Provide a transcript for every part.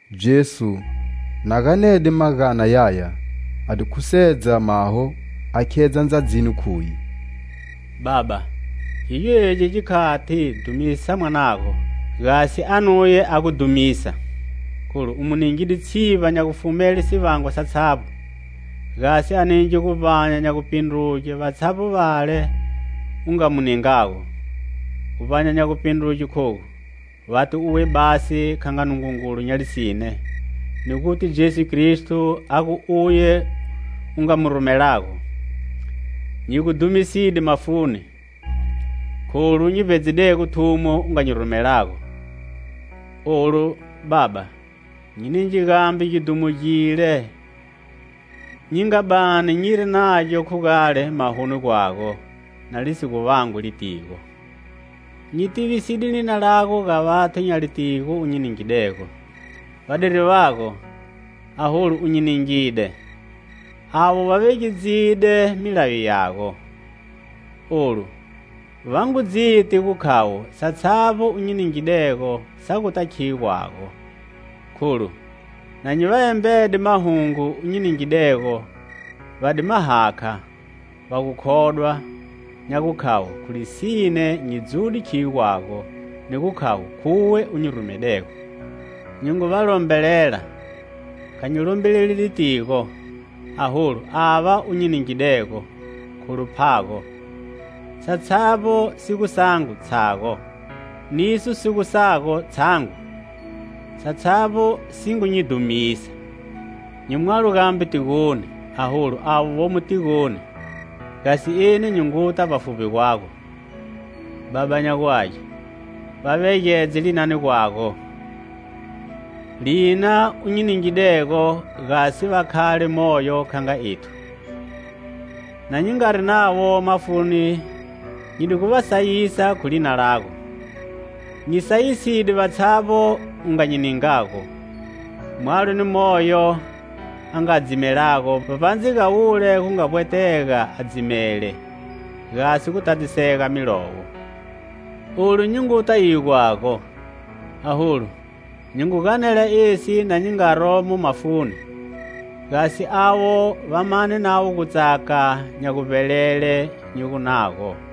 Jesu, na ganede magana yaya, a di khusedza maho a khedza ndzadzini, khuye: "Baba, khigyo egi gikhati, dhumisa Mwanago, gasi a nuye a gu dhumisa, kholu u mu ningide tshivba nya gufumele sivangwa satshavbo, gasi a ninge guvbanya nya gupindruge vatshavbo vale u nga mu ningago. Guvbanya nya gupindruge khogu: vati uwe basi kha nga Nungungulu nya lisine, ni guti Jesu Kristo, a gu uye u nga mu rumelago. Nyi gu dhumiside mafuni, kholu nyi vbedzidego thumo u nga nyi rumelago. Olu, Baba, nyi ninge gambe gidhumo gile nyi nga bani nyiri nagyo khu gale mahoni gwago, na lisi gu vangwi litigo. "Nyi tiviside lina lago ga vathu nya litigo u nyi ningidego. Vadiri vago, aholu u nyi ningide. Avo va vegedzide milayo yago. Olu va ngu dziti gu khavo satshavbo u nyi ningidego sa guta khiyo gwago, kholu, na nyi va embede mahungo u nyi ningidego, va di ma hakha, va gu khodwa nya gukhavo khu lisine nyi dzude khiyo gwago, ni gu khavo khuwe u nyi rumedego. "Nyi ngu va lombelela, kha nyi lombeleli litigo, aholu ava u nyi ningidego, kholu phago. Satshavbo si gu sangu, tshago. Niso si gu sago, tshangu; satshavbo si ngu nyi dhumisa. Nyi mwalo gambe tigoni, aholu avo vomo tigoni, gasi eni nyi nguta vbafuvbi gwago.Baba nya gu Age, va vegedze linani gwago, lina u nyi ningidego, gasi va khale moyo, kha nga ethu. Na nyi ngari navo mafuni nyi di gu va sayisa khu lina lago. Nyi sayiside vatshavbo u nga nyi ningago, mwalo ni moyo a nga dzimelago, vbavbandze ga wule gu nga vbwetega a dzimele, gasi gu tadzisega Milowo. Olu nyi nguta iyo gwago; aholu nyi ngu ganela esi na nyi nga romo mafuni, gasi avo va mane navo gutsaka nya gubelela nyi gu nago.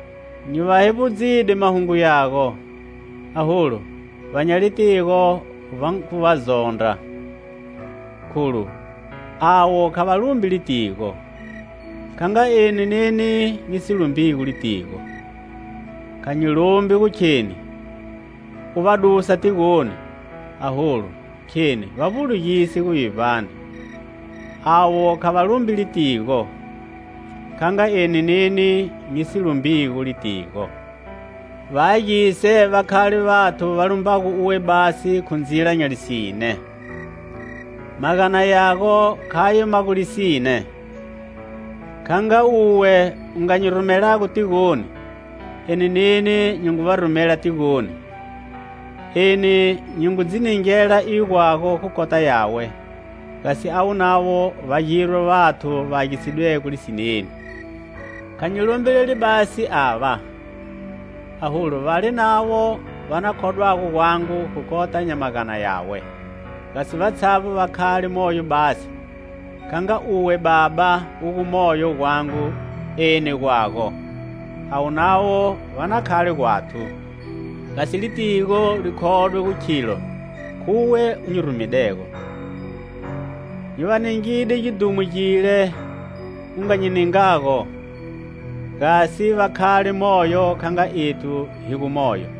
Nyi va hevbudzide mahungu yago, aholu va nya litigo va ngu va zondra kholu avo kha va lumbi litigo, kha nga eni neni nyi si lumbigo litigo. Kha nyi lombi gu kheni u va dusa tigoni, aholu kheni va vbulugise guvivbani. Avo kha va lumbi litigo, kha nga eni neni nyi si lumbigo litigo. Va agise va khale vathu va lumbago uwe basi khu ndzila nya lisine. Magana yago khayo ma gu lisine. Kha nga uwe u nga nyi rumelago tigoni, eni neni nyi ngu va rumela tigoni. Eni nyi ngu dzi ningela iyo gwago khu kota yawe, gasi avo navo va girwe vathu va agisidwego lisineni. "Kha nyi lombeleli basi ava, aholu vale navo va na khodwago gwangu khu kota nya magana yawe, gasi vatshavbo va khale moyo basi; kha nga uwe, Baba u gomo gwangu, eni gwago, avo navo va na khale gwathu, gasi litigo li khodwe gu khilo khuwe u nyi rumedego. Nyi va ningide gidhumo gile u nga nyi ningago, gasi va khale moyo kha nga ethu hi gu moyo.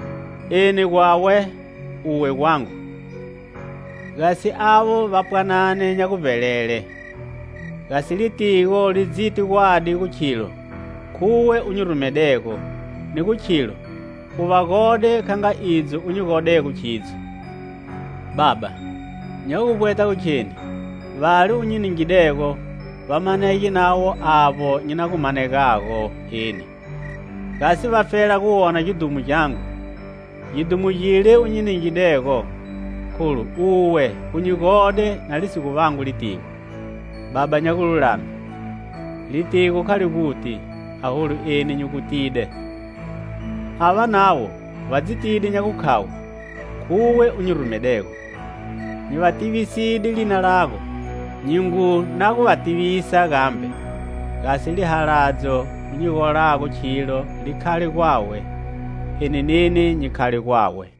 Eni gwawe, uwe gwangu, gasi avo va pwanane nya guvbelele, gasi litigo li dziti gwadi gu khilo khuwe u nyi rumedego, ni gu khilo u va gode kha nga idzo u nyi godego khidzo. "Baba, nya guvbweta gu kheni vale u nyi ningidego va manege navo avbo nyi na gu manegago eni, gasi vafela guwona gidhumo gyangu, gidhumo gile u nyi ningidego, kholu uwe u nyi gode na li si gu vangwi litigo. Baba nya gululame, litigo kha la guti, aholu eni nyi gu tide, ava navo va dzitide nya gukhavo khuwe u nyi rumedego. Nyi va tiviside lina lago; nyi ngu na gu va tivisa gambe, gasi lihaladzo u nyi golago khilo li khale gwawe, eni neni nyi khale gwawe."